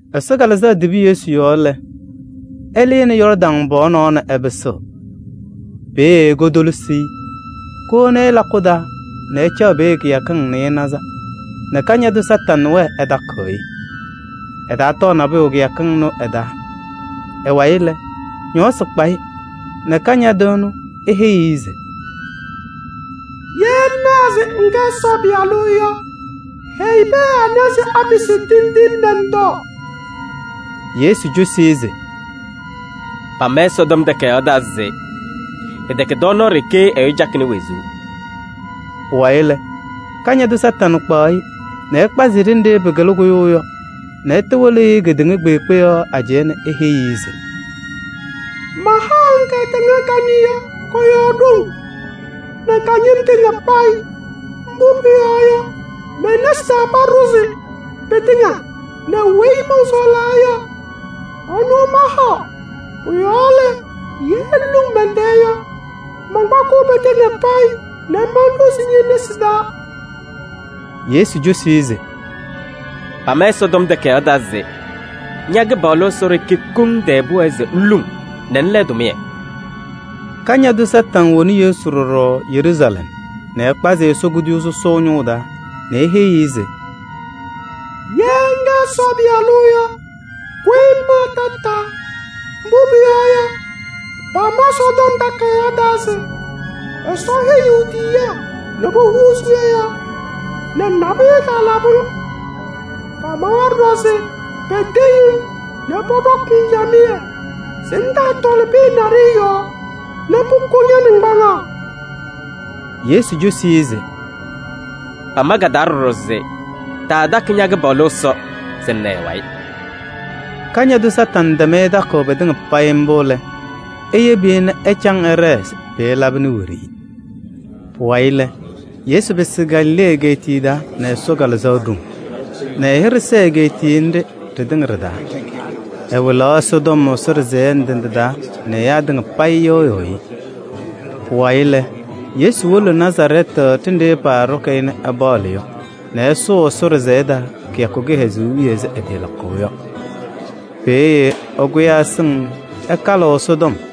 Ɛsɔ Kalɩzaɣ tibi Yesu yɔɔ lɛ, ɛlɩnɩ Yɔɔrdaŋ pɔɔ nɔɔ nɛ ɛpɩsɩɣ. Peeye kotolisi-i nɛ kowoni-i lakʋ taa nɛ ɛcaɣ peeye kɩyakɩŋ nɩɩnaza nɛ Kañadʋ Satanɩ wɛɛ ɛtakɩɣ-ɩ. Ɛtaatɔɔ nabʋyʋ kɩyakɩŋ ɩnʋ ɩ-taa. Ɩ-wayɩ lɛ, ñɔɔsɩ kpa-ɩ nɛ Kañadʋ ɛnʋ eheyi-i se: “Ye ŋkɛ Ɛsɔ Pɩyalʋ yɔ, heyi pɩyɛ ɖɩnɛ nɛ ɖɩpɩsɩ tindine nɛ ŋtɔɔ.” Yesu cosi-i se: “Pama Ɛsɔtɔm Takayaɣ taa se pɩtɛkɛ tɔɔnaɣ ɖeke ɛyʋ cakɩnɩ wezuu.” Pʋwayɩ lɛ, Kañadʋ Satanɩ kpaɣ-ɩ nɛ ɛkpazɩ-ɩ ɖenɖe pɩkɩlɩ kʋyʋʋ yɔ nɛ ɛtɩwɩlɩ-ɩ kedeŋa kpeekpe yɔɔ ajɛɛ nɛ eheyi-i se: “Mahaɣ-ŋ kedeŋa kanɛ kɔ-yɔɔ ɖoŋ nɛ ka-ñɩm tɩŋa payɩ. Mbʋ pʋyɔɔ yɔ, me-nesi taa paɖʋzɩ pɩtɩŋa nɛ weyi mɔnsɔɔlaa yɔ, ɛnʋ mahaɣ. Pʋ-yɔɔ lɛ, ye ŋluŋ mɛn-tɛɛ yɔ, mankpakɩɣ pɩtɩŋa payɩ nɛ manɖʋzɩ ñe-nesi taa.” Yesu cosi-i se: “Pama Ɛsɔtɔm Takayaɣ taa se: ‘Ña-Kɩpaɣlʋ Ɛsɔ ɖeke koŋ tɛɛ pʋwɛɛ se ŋluŋ nɛ ŋla ɛ-tʋmɩyɛ.’” Kañadʋ Satanɩ woni Yesu ɖɔɖɔ Yeruusalɛm nɛ ɛkpazɩ-ɩ Ɛsɔ kuduyuu sɔsɔʋ ñʋʋ taa nɛ eheyi-i se: “Ye ŋkɛ Ɛsɔ Pɩyalʋ yɔ, kʋyɩ ŋmaa tataa. Mbʋ pʋyɔɔ yɔ, pama Ɛsɔtɔm Takayaɣ taa se Ɛsɔ heyiɣ e-tiyiyaa nɛ pohuuzi ñɔ-yɔɔ nɛ nabʋyʋ ɛtaalabɩ-ŋ. Pamawa ɖɔɖɔ se peteŋ-ŋ nɛ pɔɖɔkɩ-ŋ camɩyɛ se ŋtaatɔlɩ pɩyɛ naɖɩyɛ yɔɔ nɛ pʋkʋ ña-naŋgbaŋaɣ.” Yesu cosi-i se: “Pama ka-taa ɖɔɖɔ se taatakɩ ña-Kɩpaɣlʋ Ɛsɔ se ŋna ɛ-wayɩ.” Kañadʋ Satanɩ tɛm-ɩ takʋʋ pɩtɩŋa pɩ-taa mbʋ lɛ, eyebi-i nɛ ɛcaŋ ɛɖɛɛ se pɩɩlabɩnɩ wiɖiyi. Pʋwayɩ lɛ, Yesu pɩsɩ Galilee egeetiye taa nɛ Ɛsɔ Kalɩzaɣ ɖoŋ nɛ ɛ-hɩɖɛ sɛɛ egeetiye nɖɩ ɖɩtɩŋa ɖɩ-taa. Ɛwɩlaɣ Ɛsɔtɔm Ɛsɔ ɖɩsɛyɛ ndɩ ndɩ taa nɛ ɛyaa tɩŋa payɩ yɩɣyɩɣ-ɩ. Pʋwayɩ lɛ, Yesu wolo Nazarɛɛtɩ ɖenɖe pɔɖɔkɩ-ɩ nɛ ɛpaɣlɩ yɔ nɛ ɛsʋʋ Ɛsɔ ɖɩsɛyɛ taa kɩyakʋ kɩhɛzʋʋ wiye ɛzɩ ɛtɩɩlakʋʋ yɔ. Peeye ɛkʋyaa ɛsɩŋ se ɛkalɩɣ Ɛsɔtɔm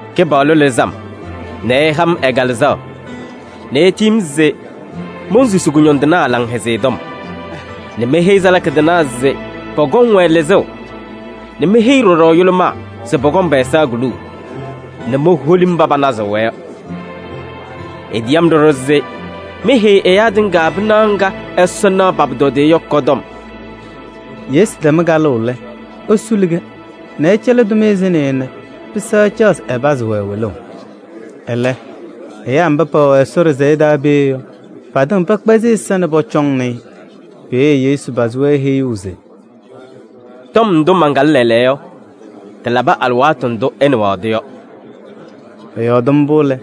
“Kɩpaɣlʋ lɩzɩ-m nɛ ɛha-m ɛ-Kalɩzaɣ nɛ etiyi-m se monsusi kʋñɔndɩnaa Laŋhɛzɩyɛ Tɔm nɛ meheyi salaka tɩnaa se pɔkɔŋ-wɛ lɩzʋʋ nɛ meheyi ɖɔɖɔ yʋlʋmaa se pɔkɔŋ pɛ-ɛza kuluu nɛ moholi mba panazɩɣ-wɛ yɔ. Etiyi-m ɖɔɖɔ se meheyi ɛyaa tɩŋa pɩnaɣ ŋga Ɛsɔ naɣ pa-pʋtɔdɩyɛ yɔ kɔ-tɔm.” Yesu tɛm kalʋʋ lɛ, esuli-kɛ nɛ ɛcɛlɩ tʋmɩyɛ sɩnɩyʋ nɛ pɩsɛɣ ɛcaɣ se ɛpazɩ-wɛ wɩlʋʋ. Ɛlɛ ɛyaa mba pɛwɛ Ɛsɔ ɖɩsɛyɛ taa peeye yɔ, patɩŋa pɛkpɛzɩ ɛza nɛ pɔcɔŋnɩ-ɩ. Peeye Yesu pazɩ-wɛ heyuu se: “Tɔm ndʋ mankalɩ lɛɛlɛɛyɔ yɔ, tɩlabɩ alɩwaatʋ ndʋ ɩnɩɣaɣ-tʋ yɔ.” Ɛyɔɔdɩ mbʋ lɛ,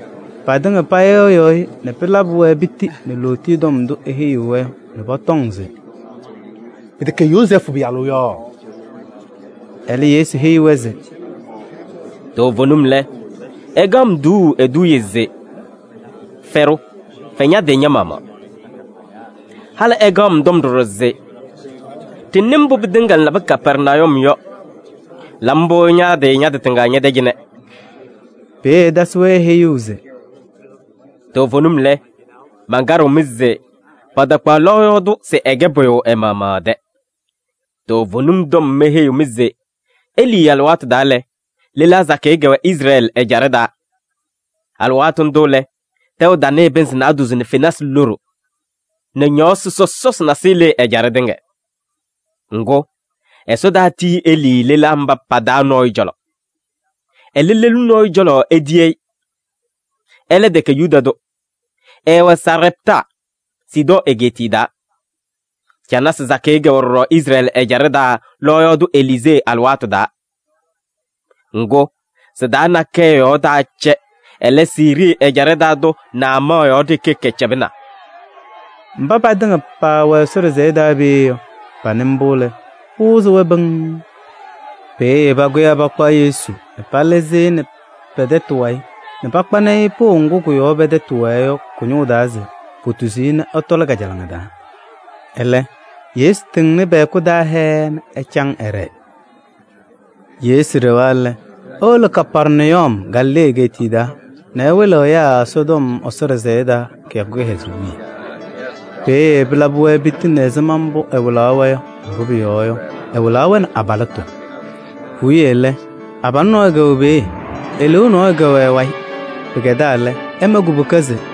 patɩŋa payɩɣyɩ-ɩ nɛ pɩlabɩ-wɛ piti nɛ lootiye tɔm ndʋ eheyi-wɛ yɔ nɛ pɔtɔŋ se: “Pɩtɛkɛ Yozɛɛfʋ pɩyalʋ yɔ?” Ɛlɛ Yesu heyi-wɛ se: “Toovenim lɛ, ɩkaɣ-m tuuu eduuye se: ‘Fɛɖʋ, fɛ ña-tɩ ña-maɣmaɣ.’ Halɩ ɩkaɣ-m tɔm ɖɔɖɔ se: ‘Ɖɩnɩ mbʋ pɩtɩŋa ŋlabɩ Kapɛrnayum yɔ, la mbʋ ña-tɩ tɩŋa ñɛ-tɛ cɩnɛ.’” Peeye ɛtasɩ-wɛ heyuu se: “Toovenim lɛ, mankaɖɩɣ-mɩ se patakpaɣ lɔɔyaɣ tʋ se ɛkɛ pʋyʋ ɛ-maɣmaɣ ɛ-tɛ. Toovenim tɔm meheyiɣ-mɩ se Elii alɩwaatʋ taa lɛ, lelaa sakɩyɛ kɛwɛ Izrɛɛlɩ ɛjaɖɛ taa. Alɩwaatʋ ndʋ lɛ, tɛʋ tanɩɩ pɩnzɩ naadozo nɛ fenasɩ loɖo nɛ ñɔɔsɩ sɔsɔsɩ nasɩyɩ lɩɩ ɛjaɖɛ tɩŋa. Ŋgʋ, Ɛsɔ taatiyi Elii lelaa mba pa-taa nɔɔyʋ cɔlɔ. Ɛlɛ, lelu nɔɔyʋ cɔlɔ etiyi-i. Ɛlɛ tɛkɛ Yuda tʋ, ɛɛwɛ Sarɛptaa, Sidɔɔ egeetiye taa. Canasɩ sakɩyɛ kɛwɛ ɖɔɖɔ Izrɛɛlɩ ɛjaɖɛ taa lɔɔyaɣ tʋ Eliizee alɩwaatʋ taa. Ŋgʋ, sɩ-taa nakɛyɛ yɔɔ taacɛ, ɛlɛ, Siirii ɛjaɖɛ taa tʋ Naamaɣ yɔɔ ɖeke kɛcɛbɩna.” Mba patɩŋa paawɛ Ɛsɔ ɖɩsɛyɛ taa peeye yɔ, panɩ mbʋ lɛ, pɩwɩzɩ-wɛ pɩŋŋ. Peeye pakʋyaa pakpa Yesu nɛ palɩzɩ-ɩ nɛ pɛ-tɛtʋ wayɩ nɛ pakpanɩ-ɩ pʋʋ ŋgʋ kʋ-yɔɔ pɛ-tɛtʋ wɛɛ yɔ kʋ-ñʋʋ taa se potuzi-i nɛ ɛtɔlɩ kajalaŋa taa. Ɛlɛ, Yesu tɩŋnɩ pɛ-hɛkʋ taa hɛɛɛ nɛ ɛcaŋ ɛɖɛɛ. Yesu ɖɛwa lɛ, ewolo Kapɛrnayum Galilee egeetiye taa nɛ ɛwɩlɩɣ ɛyaa Ɛsɔtɔm Ɛsɔ ɖɩsɛyɛ taa kɩyakʋ kɩhɛzʋʋ wiye. Peeye pɩlabɩ-wɛ piti nɛ ɛzɩma mbʋ ɛwɩlaɣ-wɛ yɔ, mbʋ pʋyɔɔ yɔ, ɛwɩlaɣ-wɛ nɛ abalɩtʋ. Puwiye lɛ, abalʋ nɔɔyʋ kɛwɛ peeye, eleeu nɔɔyʋ kɛwɛ ɛ-wayɩ. Pɩkɛdaa lɛ, ɛma kubuka se: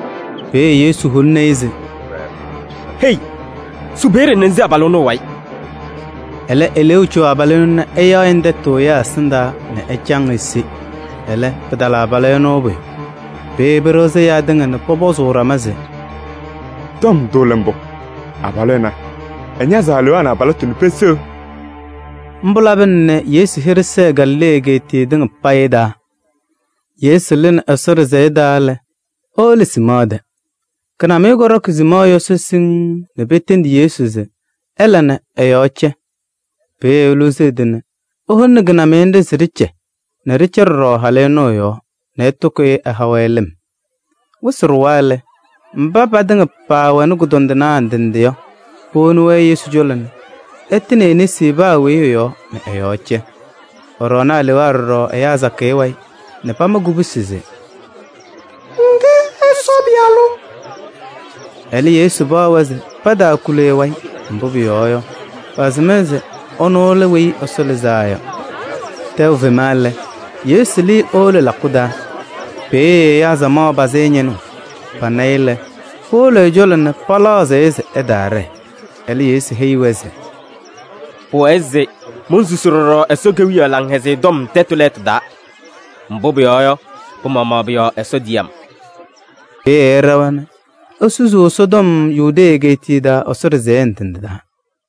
Peeye Yesu holini-i se: “Hei! Su peeye nɛ ŋse abalʋ ɛnʋ ɛ-wayɩ. Ɛlɛ eleeu co abalʋ ɛnʋ nɛ ɛyaɣ-ɩ nɛ tɛtʋ ɛyaa ɛsɩndaa nɛ ɛcaŋ ese. Ɛlɛ, pɩtala abalʋ ɛnʋ pʋyʋ.” Peeye pɩɖɩɣzɩ ɛyaa tɩŋa nɛ pɔpɔzʋʋ ɖama se: “Tɔm ndʋ lɛ mbʋ? Abalʋ ɛnɛ, ɛñazɩɣ alewaa nɛ abalɩtʋ nɛ peseɣ.” Mbʋ labɩna nɛ Yesu hɩɖɛ sɛɛ Galilee egeetiye tɩŋa payɩ taa. Yesu lɩnɩ Ɛsɔ ɖɩsɛyɛ taa lɛ, ewolo Siimɔɔ tɛ. Kɩnamɩyɛ kɔɖɔkɩ Siimɔɔ yɔsɔ siŋŋ nɛ petendi Yesu se ɛla nɛ ɛ-yɔɔ cɛ. Peeye Eluzi ɛ-tɩ nɛ eholini kɩnamɩyɛ nɖɩ se ɖɩcɛ nɛ ɖɩcɛ ɖɔɖɔ halʋ ɛnʋ ɛ-yɔɔ nɛ ɛtɩkʋyɩ ɛha-wɛ lɩm. Wɩsɩ ɖʋwa lɛ, mba patɩŋa paawɛnɩ kʋdɔndɩnaa ndɩ ndɩ yɔ, powoni-wɛ Yesu cɔlɔ nɛ ɛtɩnɩ e-nesi paa weyi ɛ-yɔɔ nɛ ɛ-yɔɔ cɛ. Ɛɖɔɔnɩ alewaa ɖɔɖɔ ɛyaa sakɩyɛ wayɩ nɛ pamakɩ kubusi se: “Ŋkɛ Ɛsɔ Pɩyalʋ.” Ɛlɛ, Yesu paɣ-wɛ se pataakuli ɛ-wayɩ. Mbʋ pʋyɔɔ yɔ, pasɩm-ɩ se ɛnʋ lɛ Weyi Ɛsɔ Lɩzaa Yɔ. Tɛʋ tɩfema lɛ, Yesu lɩɩ ewolo lakʋ taa. Peeye ɛyaa samaɣ pazɩ-ɩ ñɩnʋʋ. Pana-ɩ lɛ, powolo ɛ-cɔlɔ nɛ palaɣzɩɣ-ɩ se ɛtaaɖɛɛ. Ɛlɛ, Yesu heyi-wɛ se: “Pʋwɛɛ se monsusi ɖɔɖɔ Ɛsɔ Kewiyaɣ Laŋhɛzɩyɛ Tɔm tɛtʋ lɛɛtʋ taa. Mbʋ pʋyɔɔ yɔ, pɩ-maɣmaɣ pʋ-yɔɔ Ɛsɔ tiyi-m.” Peeye ɛɖɛwa nɛ esusuu Ɛsɔtɔm Yudee egeetiye taa Ɛsɔ ɖɩsɛyɛ ndɩ ndɩ taa.